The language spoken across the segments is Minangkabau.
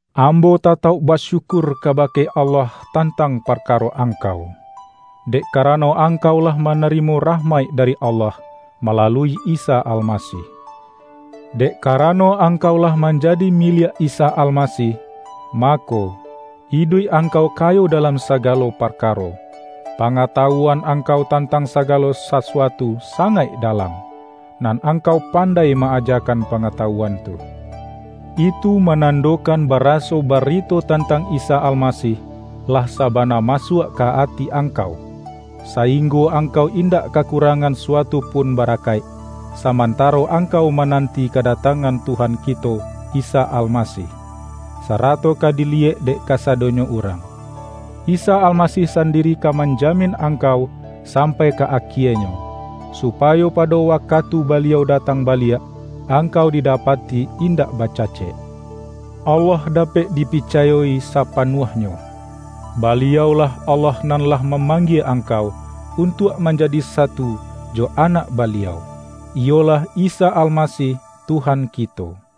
Ambo tatauk basyukur kabake Allah tantang parkaro angkau, dek karano angkau lah manarimo rah-maik dari Allah, malalui Isa Alma-sih. Dek karano angkau lah man-jadi miliak Isa Almasih, mako, iduik angkau kayo dalam sagalo parkaro. Pangatawuan angkau tantang saga-lo sasuatu sangaik dalam, nan ang-kau pandai ma-ajakan pangatawuan tu. Itu manandokan baraso bari-to tantang Isa Almasih, lah saba-na masuak ka ati angkau, sainggo angkau indak kakurangan suatu pun barakaik, samantaro angkau manan-ti kadatangan Tuhan kito Isa Alma-sih, sarato ka diliyek dek kasadonyo urang. Isa Almasih sandiri ka manjamin angkau sampai ka akienyo; supayo pado wakatu Baliau datang baliak, angkau didapati indak baca-cek. Allah dapek dipicayo-i sapa-nuahnyo. Baliau-lah Allah nan lah mamanggie angkau, untuak manjadi satu jo Anak Baliau, iyolah Isa Al-masih, Tuhan kito.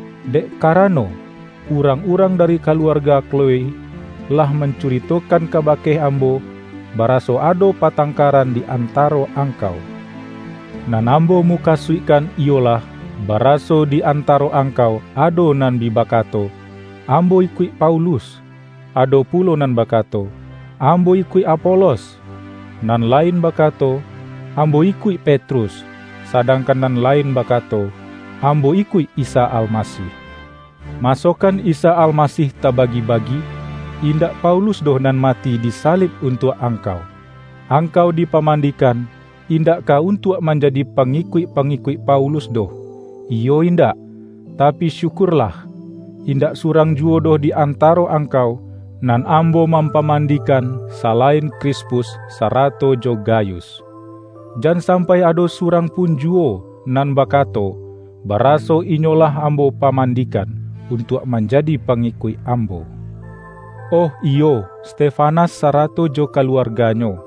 Dek ka-rano, urang-urang dari kaluarga Klo"e lah mancuritokan kabake ambo, ba-raso ado patangkaran di antaro ang-kau. Nan ambo mukasuikkan iyo-lah, baraso di antaro angkau ado nan bi bakato,”Ambo ikuik Paulus,” ado pulo nan bakato,”Ambo ikuik Apo-los,” nan lain bakato, ’Ambo ikuik Pet-rus,” sadangkan nan lain bakato,”Am-bo ikuik Isa Almasih.” Masokan Isa Almasih tabagi-bagi! Indak Paulus doh nan mati disalib untuak angkau! Ang-kau dipamandikan, indak ka untuak manjadi pangikuik-pangikuik Paulus doh, iyo indak? Tapi syukurlah, indak surang ju-wo doh di antaro angkau, nan ambo mampamandikan, salain Krispus, sara-to jo Gayus. Jan sampai ado surang pun juwo nan bakato, baraso inyo lah ambo pamandikan, untuak manjadi pangikuik ambo. Oh iyo, Stefanas sarato jo kaluarganyo,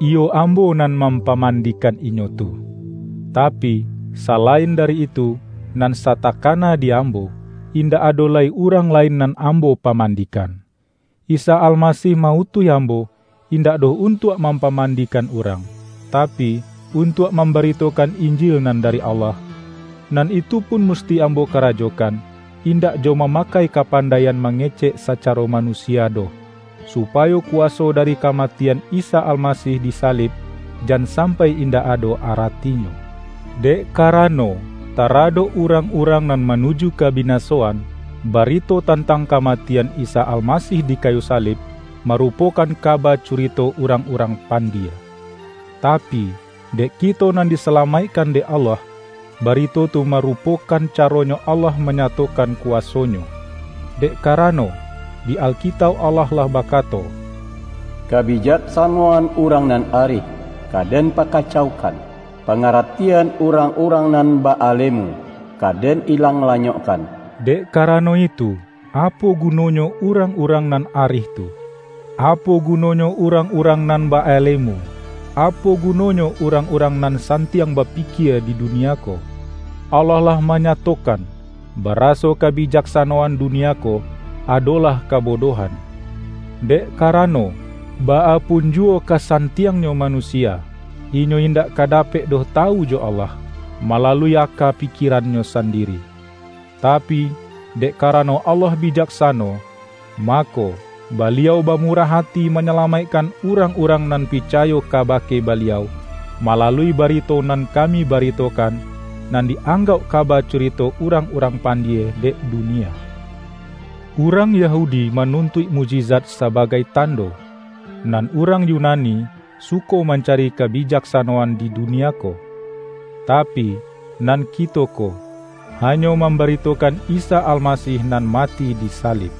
iyo ambo nan mampamandikan inyo tu. Tapi, sala-in dari itu, nan satakana di ambo, in-dak ado lai urang lain nan ambo pa-mandikan. Isa Almasih ma-utuih ambo, indak doh untuak mampaman-dikan urang, tapi, untuak mambarito-kan Injil nan dari Allah; nan itu pun musti ambo karajokan, indak jo ma-makai kapandaian mangecek sacaro manusia doh, supayo kuwaso dari ka-matian Isa Almasih di salib, jan sam-pai indak ado aratinyo. Dek karano, taradok urang-urang nan manuju kabinasoan, barito tantang kamatian Isa Almasih di kayu salib, marupokan kaba curito urang-urang pandie. Tapi, dek kito nan disalamaik-kan dek Allah, barito tu marupokan caronyo Allah manyatokan kuwaso-Nyo. Dek karano, di Alkitauk Allah lah bakato,”Kabijaksanoan urang nan arih, ka Den pakacaukan, pangaratian urang-urang nan ba-alemu, ka Den ilang lanyokkan.” Dek karano itu, apo gunonyo urang-urang nan arih tu? Apo guno-nyo urang-urang nan ba-alemu? Apo gunonyo urang-urang nan santiang bapikie di dunia ko? Allah lah manya-tokan, baraso kabijaksanoan dunia ko, adolah kabodohan! Dek karano, baa punjuwo kasan-tiangnyo manusia, inyo indak ka dapek doh tawu jo Allah, malalui aka pikie-rannyo sandiri. Tapi, dek karano Allah bijaksano, mako, Baliau bamurah ati manyalamaikkan urang-urang nan pi-cayo kabake Baliau, malalui barito nan kami baritokan, nan di-anggauk kaba curito urang-urang pandie dek dunia. Urang Yahudi manuntuik mukjizat sabagai tando, nan urang Yunani, suko mancari kabijaksanoan di dunia ko. Tapi, nan kito ko, hanyo mam-baritokan Isa Almasih nan mati disa-lib.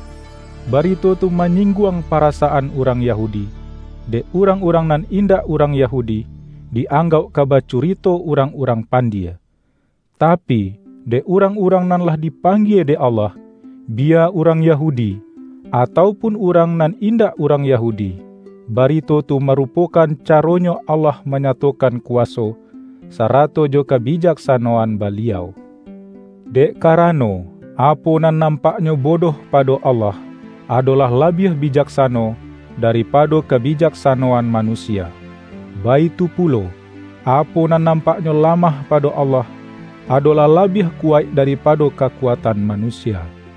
Barito tu manyingguang parasa-an urang Yahudi, dek urang-urang nan indak urang Yahudi, di-anggauk ka-ba curito urang-urang pandie. Tapi, dek urang-urang nan lah dipanggie dek Allah, - biya urang Yahudi, atau pun urang nan indak urang Yahudi, - ba-rito tu marupokan caronyo Allah ma-nyatokan kuwaso, sarato jo kabijaksa-noan Baliau. Dek karano, apo nan nampaknyo bodoh pado Allah, ado-lah labiah bijaksano, daripado kabi-jaksanoan manusia; baitu pulo, apo nan nampaknyo lamah pado Allah, adolah labiah kuwaik daripado ka-kuatan manusia.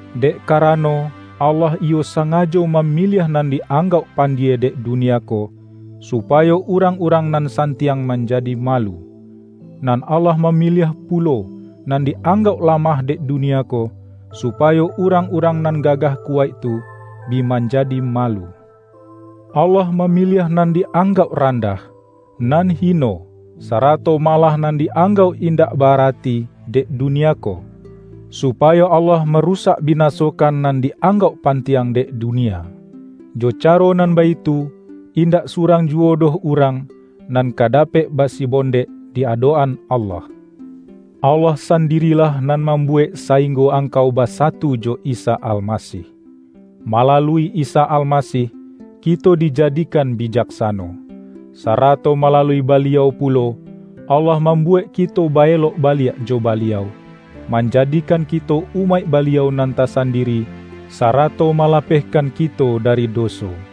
Dek karano, Allah iyo sangajo mamiliah nan di-anggauk pandie dek dunia ko, supa-yo urang-urang nan santiang manjadi malu. Nan Allah mamiliah pulo nan di-anggauk lamah dek dunia ko, su-payo urang-urang nan gagah kuwaik tu, bi manjadi malu. Allah mami-liah nan di-anggauk randah, nan hi-no, sarato malah nan di-anggauk indak ba-arati dek dunia ko, supayo Allah marusak binasokan nan di-anggauk pantiang dek dunia. Jo caro nan baitu, indak surang juwo doh urang, nan ka dapek basibondek di adok-an Allah. Allah sandirilah nan mam-buwek sainggo angkau basatu jo Isa Almasih. Malalui Isa Almasih, kito di-jadikan bijaksano. Sarato malalui Ba-liau pulo, Allah mambuwek kito baelok baliak jo Baliau, manjadikan kito umaik Baliau nan tasandiri, sarato ma-lapehkan kito dari doso.